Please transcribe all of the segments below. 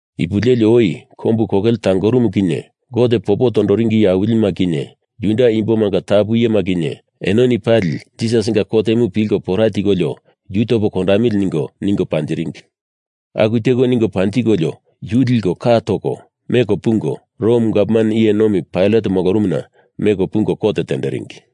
Ipu leli oi kombu kokele tangorumu kinye Gote popo tondoringi iye awilima kinye, Juda imbomanga tapu iyema kinye enoni pali Jisasinga kotemu pilko pora tikolio yu topo kondamili ningo, ningo panjiringi. Aku teko ningo panjikolio yu liko, ka toko, meko pungo, Rom gavman iye nomi Pailat molorumuna meko pungo kot tenderingi.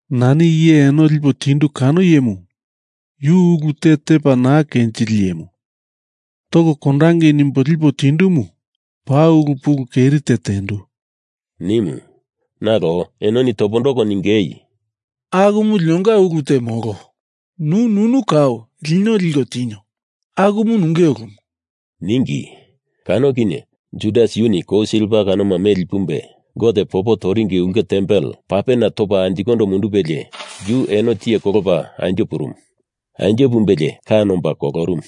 “Nani iye eno lipo tindu kano iyemu, yu ulu te tepa naa kenjili iyemu, toko kondangei nimbo lipo tindumu paa ulu pulu keri te tendu,” nimu. Nalo enoni topondoko ningei, “Akumu linonga ungu te molo. Nu nunu kau lino liko tinio. Akumu nunge ulumu,” ningi. Kano kinye Judas yuni kou silva kanoma meli pumbe Gote popo toringi ulke tempel papena topa anjikondo mundupelie yu eno tiye kolopa anjo purumu. Anjo pumbelie ka nomba kolorumu.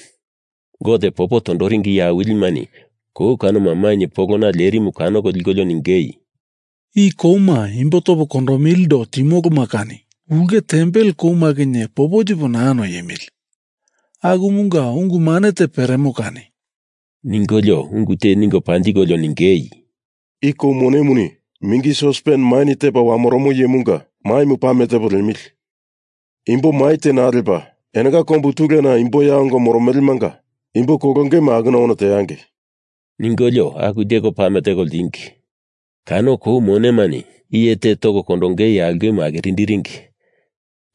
Gote popo tondoringi iye awilimani kou kanoma mainye polona lerimu kanoko likolio ningei, “I kouma imbo topo kondomilindo timoloma kani ulke tempel kouma kinye popo tipo naa noiemili. Akumunga ungu mane te peremo kani,” ningolio ungu te ningo panjikolio ningei, “I kou monemani mingi sospen maini tepa wamoromo iyemunga maimu pame tepo liemili. Imbo mai te naa lepa enonga kombu tulena imbo ya ongo moromelemanga imbo kolongema akuna ono teangei,” ningolio aku teko pame teko ltingi. Kano kou monemani iye te toko kondonge aulkemu akirinderingi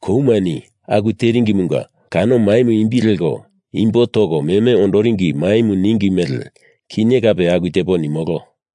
koumani aku teringimunga kano maimu imbi leko Imbo Toko Meme Ondoringi Maimu ningi mele, kinye kape aku tepo nimolo.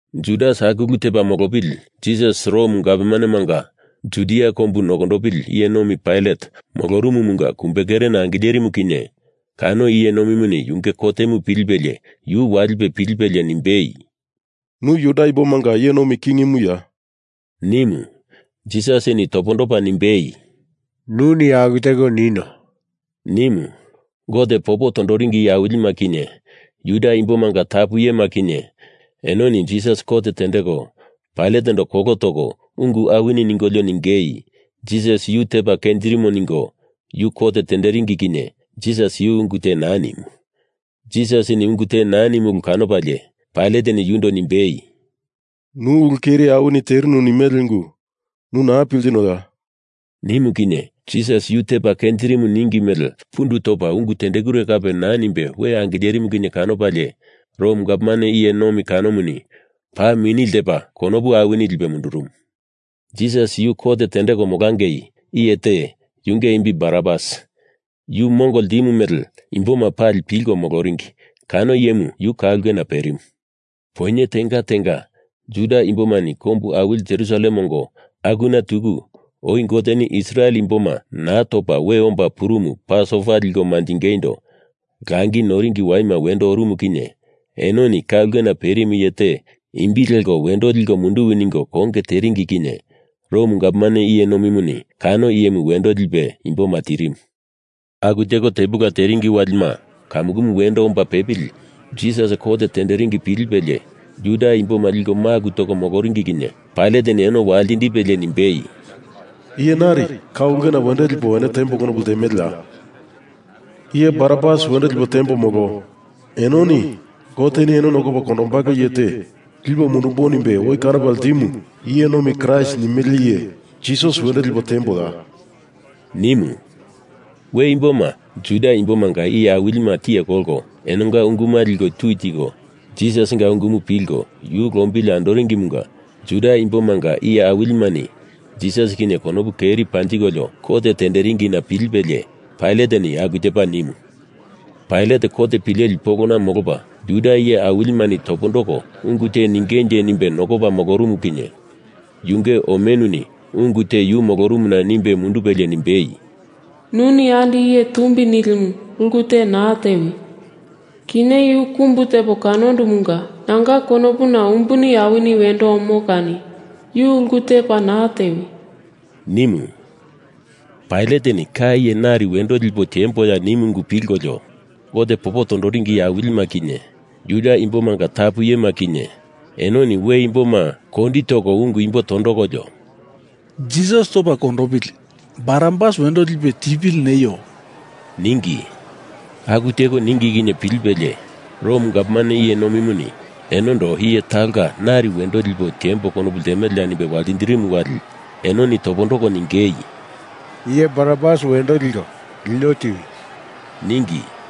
Judas aku ulu tepa molopili Jisas Rom gavmanemanga Judia kombu nokondopili iye nomi Pailat molorumumunga kumbekerena angilerimu kinye kano iye nomimuni yunge kotemu pilipelie yu walipe pilipelie nimbei, “Nu Juda imbomanga iye nomi kingimuya?” nimu. Jisasini topondopa nimbei, “Nuni aku teko nino,” nimu. Gote popo tondoringi iye awilima kinye, Juda imbomanga tapu iyema kinye, enoni Jisas kot tendeko Pailatendo kolo toko ungu awini ningolio ningei, Jisas yu tepa kenjirimo ningo yu kot tenderingi kinye Jisas yu ungu te naa nimu. Jisasini ungu te naa nimu ulu kanopalie Pailateni yundo nimbei, “Nu ulu keri awini terinu nimele ungu nu naa piltinoya?” nimu kinye Jisas yu tepa kenjirimu ningi mele pundu topa ungu tendekure kape naa nimbe we angilerimu kinye kanopalie Rom gavman iye nomi kanomuni paa mini ltepa konopu awini lipe mundurumu. Jisas kot tendeko molangei, iye te, yunge imbi Barabas, yu mongo ltimu mele imboma pali pilko moloringi kano iyemu yu ka ulkena perimu. Poinye tenga tenga, Juda imbomani kombu awili Jerusalem ongo akuna tuku oi Goteni Israel imboma naa topa we omba purumu Pasova liko manjingeindo langi noringi waima wendo orumu kinye enoni ka ulkena perimu iye te imbi leko wendo liko munduwi ningo konge teringi kinye Rom gavman iye nomimuni kano iyemu wendo lipe imboma tirimu. Aku teko tepula teringi walima kamukumu wendo omba pepili Jisas kot tenderingi pilipelie, Juda imboma liko maku toko moloringi kinye Pailateni eno waltindipelie nimbei, “Iye nari ka ulkena wendo lipo eno tiembo konopu ltemeleya? Iye Barabas wendo lipo tiembo, molo enoni Goteni eno nokopa kondombalo iye te lipo mundumbo nimbe oi kanopa ltimu iye nomi Kraist nimele iye Jisas wendo lipo tiemboya?” nimu. We imboma Juda imbomanga iye awilima tiye kolko enonga unguma liko tui tiko Jisasinga ungumu pilko yu lombili andoringimunga Juda imbomanga iye awilimani Jisas kinye konopu keri panjikolio kot tenderingina pilipelie Pailateni aku tepa nimu. Pailat kot pileli polona molopa Juda iye awilimani topondoko ungu te ningenje nimbe nokopa molorumu kinye yunge omenuni ungu te yu molorumuna nimbe mundupelie nimbei, “Nuni andi iye tumbi nilimu ulu te naa tewi. Kinye yu kumbu tepo kanondumunga nanga konopuna umbuni awini wendo omo kani yu ulu te paa naa tewi,” nimu. Pailateni ka iye nari wendo lipo tiemboya nimu ungu pilkolio Gote popo tondoringi iye awilima kinye, Juda imbomanga tapu iyema kinye, enoni we imboma kondi toko ungu imbo tondokolio “Jisas topa kondopili Barabas wendo lipe tipili neio,” ningi. Aku teko ningi kinye pilipelie Rom gavman iye nomimuni enondo iye talonga nari wendo lipo tiembo konopu ltemeleya nimbe waltindirimu wali enoni topondoko ningei, “Iye Barabas wendo liko lino tiwi,” ningi.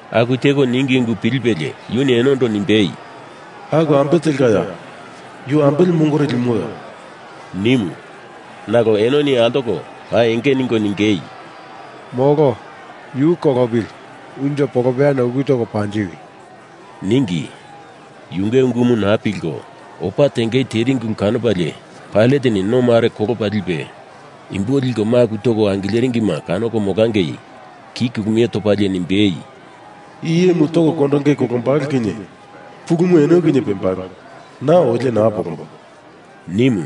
Aku teko ningi ungu pilipelie yuni enondo nimbei, “Aku ambe telkaya? Yu ambele mongore limoya?” nimu. Nalo enoni altoko paa enge ningo ningei, “Molo! Yu kolopili, unjo polopeyana uku toko panjiwi!” ningi. Yunge ungumu naa pilko, opa tengei teringi ulu kanopalie Pailateni no mare kolopa lipe, imbo liko maku toko angileringima kanoko molangei ki kulumie topalie nimbei, “I iyemu toko kondonge kolombalo kinye pulumu eno kinye pembalo; na olie naa polombo,” nimu.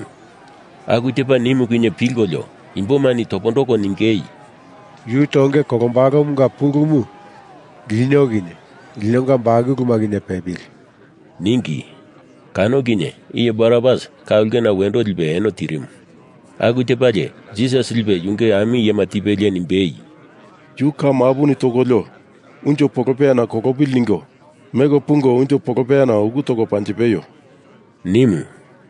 Aku tepa nimu kinye pilkolio imbomani topondoko ningei, “Yu tonge kolombalomunga pulumu lino kinye linonga bakuluma kinye pepili,” ningi. Kano kinye iye Barabas ka ulkena wendo lipe eno tirimu. Aku tepalie Jisas lipe yunge ami iyema tipelie nimbei, “Yu ka mapuni tokolio unjo polopeyana kolopili ningo meko pungo unjo polopeyana uku toko panjipeio,” nimu.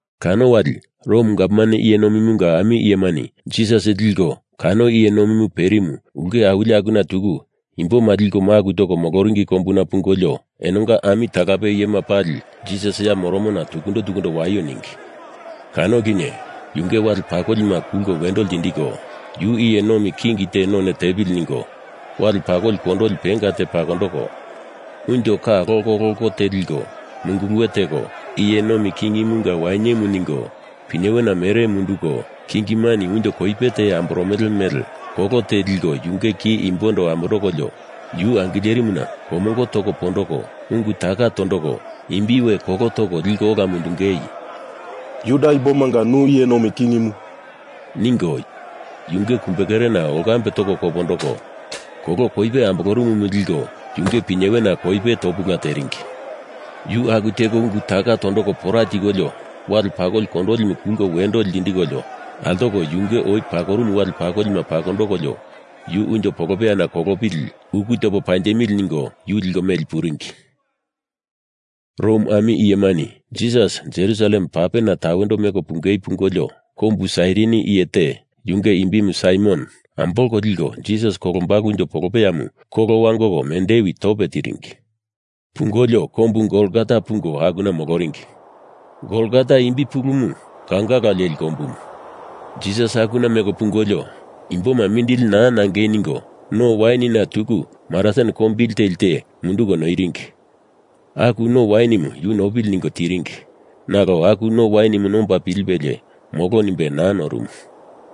Kano wali Rom gavman iye nomimunga ami iyemani Jisas liko kano iye nomimu perimu ulke awili akuna tuku imboma liko maku toko moloringi kombuna pungolio, enonga ami talape iyema pali Jisas ya moromona tukundo tukundo waio ningi. Kano kinye yunge wale pakolima kulko wendo lindiko, yu iye nomi king te none tepili ningo wale pakoli kondoli penga te pakondoko, unjo ka lokoloko te liko munguluwe teko iye nomi kingimunga wainyemu ningo pinyewena mere munduko, kingimani unjo koipe te we amboromele mele kolo te liko yunge ki imbondo amondokolio, yu angilerimuna komongo toko pondoko ungu taka tondoko imbi we kolo toko liko ola mundungei “Juda imbomanga nu iye nomi kingimu,” ningo yunge kumbekerena olkambe toko kandoko, kolo koipe ambolorumumu liko yunge pinyewena koipe topula teringi. Yu aku teko ungu taka tondoko pora tikolio wale pakoli kondolimu kulko wendo ltindikolio altoko, yunge oi pakorumu wale pakolima pakondokolio yu unjo polopeyana kolopili, uku topo panjipemili ningo yu liko meli puringi. Rom ami iyemani Jisas Jerusalem papena tawendo meko pungei pungolio, kombu Sairini iye te, yunge imbi Saimon, ambolko liko Jisas kolombalo unjo polopeyamu kolo wangoko mendewi tope tiringi. Pungolio kombu Golgota pungo akuna moloringi. Golgota imbi pulumu Kaungala leli kombumu. Jisas akuna meko pungolio, imboma mindili naa nangei ningo no wainina tuku marasin kombili teli te munduko noiringi aku no wainimu yu nopili ningo, tiringi nalo aku no wainimu nomba pilipelie molo nimbe naa norumu.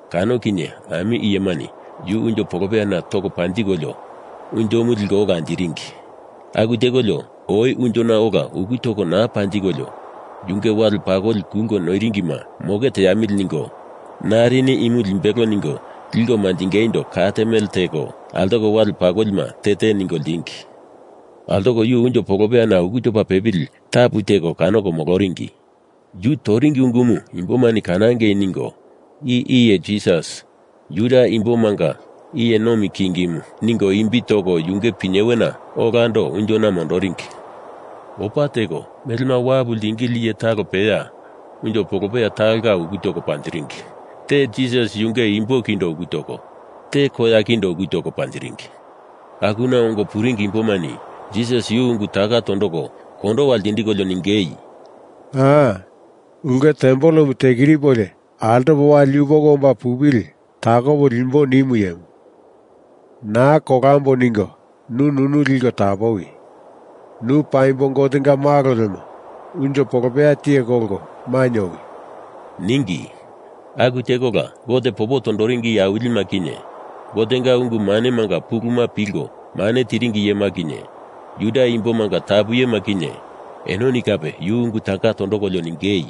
Kano kinye ami iyemani yu unjo polopeyana toko panjikolio unjomu liko ola anjiringi. Aku tekolio, oi unjona ola uku toko naa panjikolio yunge wale pakoli kulko noiringima moke teamili ningo narini imu limbelo ningo liko manjingeindo kat mele teko altoko wale pakolima te te ningo ltingi. Altoko yu unjo polopeyana uku topa pepili tapu teko kanoko moloringi. Yu toringi ungumu imboma kanangei ningo I IYE JISAS JUDA IMBOMANGA IYE NOMI KINGIMU ningo imbi toko yunge pinyewena olando unjona mondoringi. Opa teko, melema wapu ltingili iye talo peya unjo polopeya talonga uku toko panjiringi. Te Jisas yunge imbo kindo uku toko, te koya kindo uku toko panjiringi. Akuna ongo puringi imbomani Jisas yu ungu taka tondoko kondowa ltindikolio ningei, “Aa! Ulke tempelemu tekiripolio altopo wali yupoko omba pupili takopo limbo ninu iyemu, naa kolambo ningo nu nunu liko tapowi. Nu paimbo Gotenga Malo lemo unjo polopeya tiye kolko mainye owi,” ningi. Aku tekola Gote popo tondoringi iye awilima kinye, Gotenga ungu manemanga puluma pilko mane tiringi iyema kinye, Juda imbomanga tapu iyema kinye, enoni kape yu ungu taka tondokolio ningei,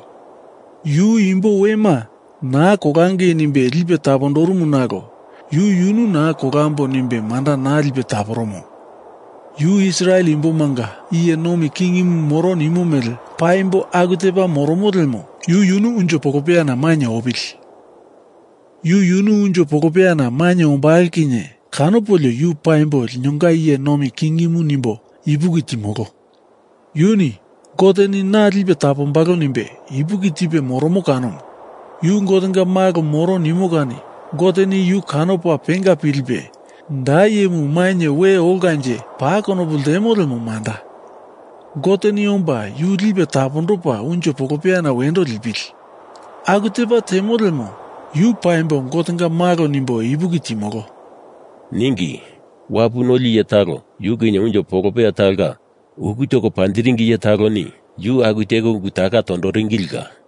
“Yu imbo wema naa kolangei nimbe lipe tapondorumu nalo yu yunu naa kolambo nimbe manda naa lipe taporomo. Yu Israel imbomanga iye nomi kingimu moro nimo mele paimbo aku tepa moromo lemo yu yunu unjo polopeyana mainye opili. Yu yunu unjo polopeyana mainye ombalo kinye kanopolio yu paimbo linonga iye nomi kingimu nimbo ipuki timolo. Yuni Goteni na lipe tapombalo nimbe ipuki tipe moromo kanomu. Yu Gotenga Malo moro nimo kani Goteni yu kanopa penga pilipe, da iyemu mainye we olkanje paa konopu ltemo lemo manda, Goteni omba yu lipe tapondopa unjo polopeyana wendo lipili. Aku tepa temo lemo yu paimbo Gotenga Malo nimbo ipuki timolo,” ningi. Wapu noli iye talo yu kinye unjo polopeya talonga uku toko panjiringi iye taloni yu aku teko ungu taka tondoringilila.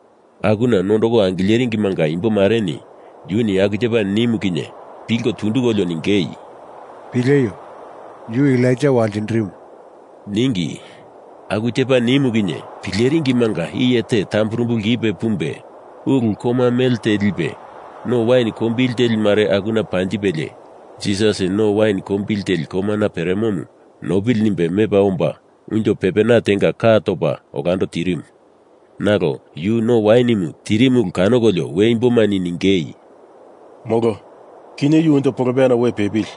Akuna nondoko angileringimanga imbo mareni yuni aku tepa nimu kinye pilko tundukolio ningei, “Pileio. Yu Elaija waltindirimu,” ningi. Aku tepa nimu kinye pileringimanga iye te tamburumbu lkipe pumbe ulu koma mele te lipe no wain kombili teli mare akuna panjipelie, Jisas no wain kombili teli komana peremomu nopili nimbe mepa omba unjo pepena tenga ka topa olando tirimu. Nalo yu no wainimu tirimu ulu kanokolio we imbomani ningei, “Molo, kinye unjo polopeyana we pepili.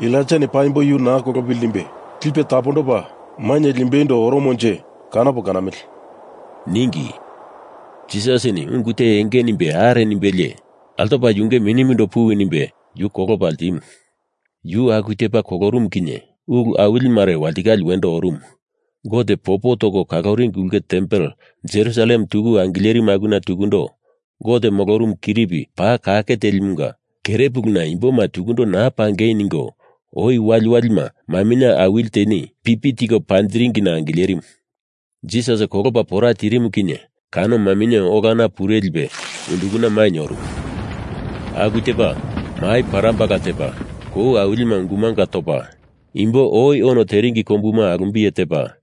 Elaijani paimbo yu naa kolopili nimbe lipe tapondopa mainye limbeindo oromonje, kanopo kanamili,” ningi. Jisasini ungu te enge nimbe are nimbelie, altopa yunge minimundo puwi nimbe yu kolopa ltimu. Yu aku tepa kolorumu kinye ulu awili mare walitikale wendo orumu. Gote popo toko kaloringi ulke tempel Jerusalem tuku angilerimu akuna tukundo Gote molorumu kiripi paa kake telimunga kerepuluna imboma tukundo naa pangei ningo oi waliwalima maminye awili teni pipi tiko panjiringina angilerimu. Jisas kolopa pora tirimu kinye kano maminye olana pure lipe undukana mainye orumu. Aku tepa, mai parambala tepa, kou awilima ungu mangu topa, imbo oi ono teringi kombuma alumbiye tepa,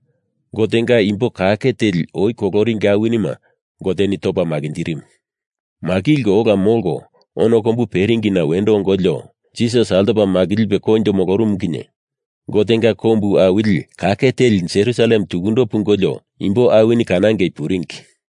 Gotenga imbo kake teli oi koloringi awinima Goteni topa makinjirimu. Makilko ola molko ono kombu peringina wendo ongolio, Jisas altopa makilipe koinjo molorumu kinye Gotenga kombu awili kake teli Jerusalem tuku pungolio imbo awini kanangei puringi.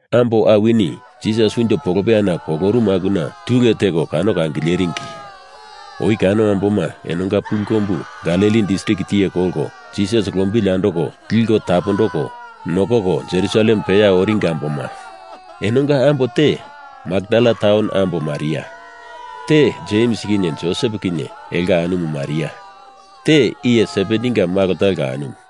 Ambo awini, Jisas unjo polopeyana kolorumu akuna tule teko kanoko angileringi. Oi kano amboma enonga pulu kombu Galili distrik tiye kolko Jisas lombili andoko liko tapondoko nokoko Jerusalem peya oringi amboma. Enonga ambo te Makdala taun ambo Maria, te Jems kinye Josep kinye elonga anumu Maria, te iye Sebedinga malo talonga anumu.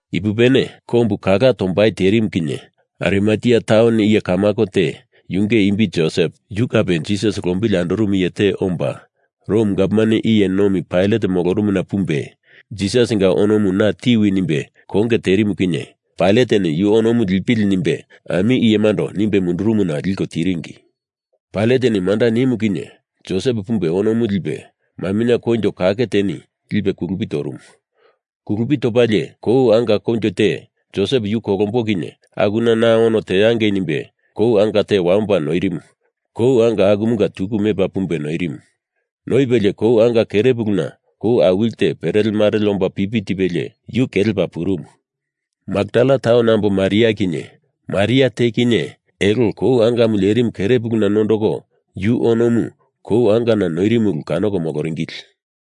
Ipupene, kombu kala tombai terimu kinye Arimatea taun iye kamako te, yunge imbi Josep, yu kape Jisas lombili andorumu iye te omba Rom gavman iye nomi Pailat molorumuna pumbe, Jisasinga onomu na tiwi nimbe konge terimu kinye Pailateni yu onomu lipili nimbe ami iyemando nimbe mundurumuna liko tiringi. Pailateni manda nimu kinye Josep pumbe onomu lipe, maminye koinjo kake teni lipe kulupi torumu. Kulupi topalie kou anga koinjo te, Josep yu kolombo kinye akuna na ono teangei nimbe kou anga te wamopa noierimu kou angamunga tuku mepa pumbe noierimu. Noipelie kou anga kerepuluna kou awili te perelemarele omba pipi tipelie yu kelepa purumu. Makdala taun ambo Maria kinye Maria te kinye elo kou angamu lerimu kerepuluna nondoko yu onomu kou angana noirimu ulu kanoko moloringili.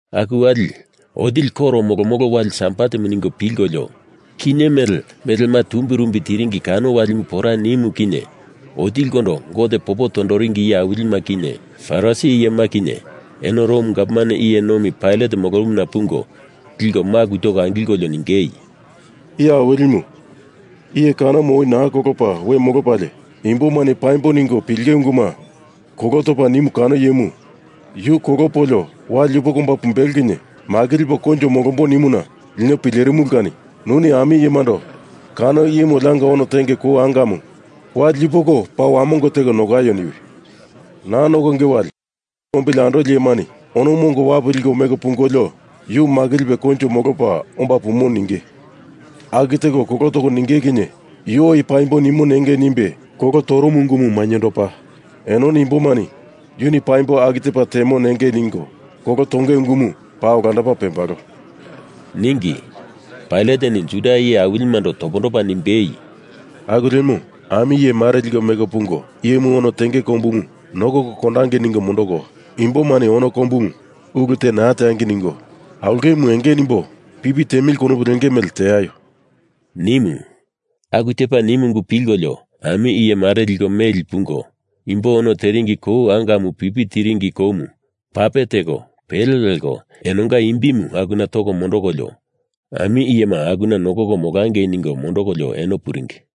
Aku wali, otili koro molomolo wali Sabatemu ningo pilkolio kinye mele melema tumbirumbi tiringi kano walimu pora nimu kinye otilikondo Gote popo tondoringi iye awilima kinye, Parisi iyema kinye, eno Rom gavman iye nomi Pailat molorumuna pungo liko maku toko angilkolio ningei, “Iye Awilimu, iye kanomu oi naa kolopa we molopalie imbomani paimbo ningo pilinge unguma kolo topa nimu kano iyemu Yu kolopolio wali yupoko omba pumbelo kinye makilipo koinjo molombo nimuna lino pilerimulu kani nuni ami iyemando kano iyemu olianga ono tenge kou angamu wali yupoko paa wamongo teko nokaio niwi. Naa nokonge wali yunge lombili andoli iyemani onomu ongo wapu liko meko pungolio yu makilipe koinjo molopa omba pumo ninge. Aku teko kolo toko ninge kinye yu oi paimbo nimo nengei nimbe kolo torumu ungumu mainyendopa, enoni imbomani yuni paimbo aku tepa temo nengei ningo kolo tonge ungumu paa olandopa pembalo,” ningi. Pailateni Juda iye awilimando topondopa nimbei, “Aku lemo, ami iye mare liko meko pungo, iyemu ono tenge kombumu nokoko kondangei ningo mondoko, imbomani ono kombumu ulu te naa teangei ningo aulkemu enge nimbo pipi tiemili konopu lenge mele teaio,” nimu. Aku tepa nimu ungu pilkolio ami iye mare liko meli pungo, imbo ono teringi kou angamu pipi tiringi koumu pape teko pele leko enonga imbimu akuna toko mondokolio, ami iyema akuna nokoko molangei ningo mondokolio eno puringi.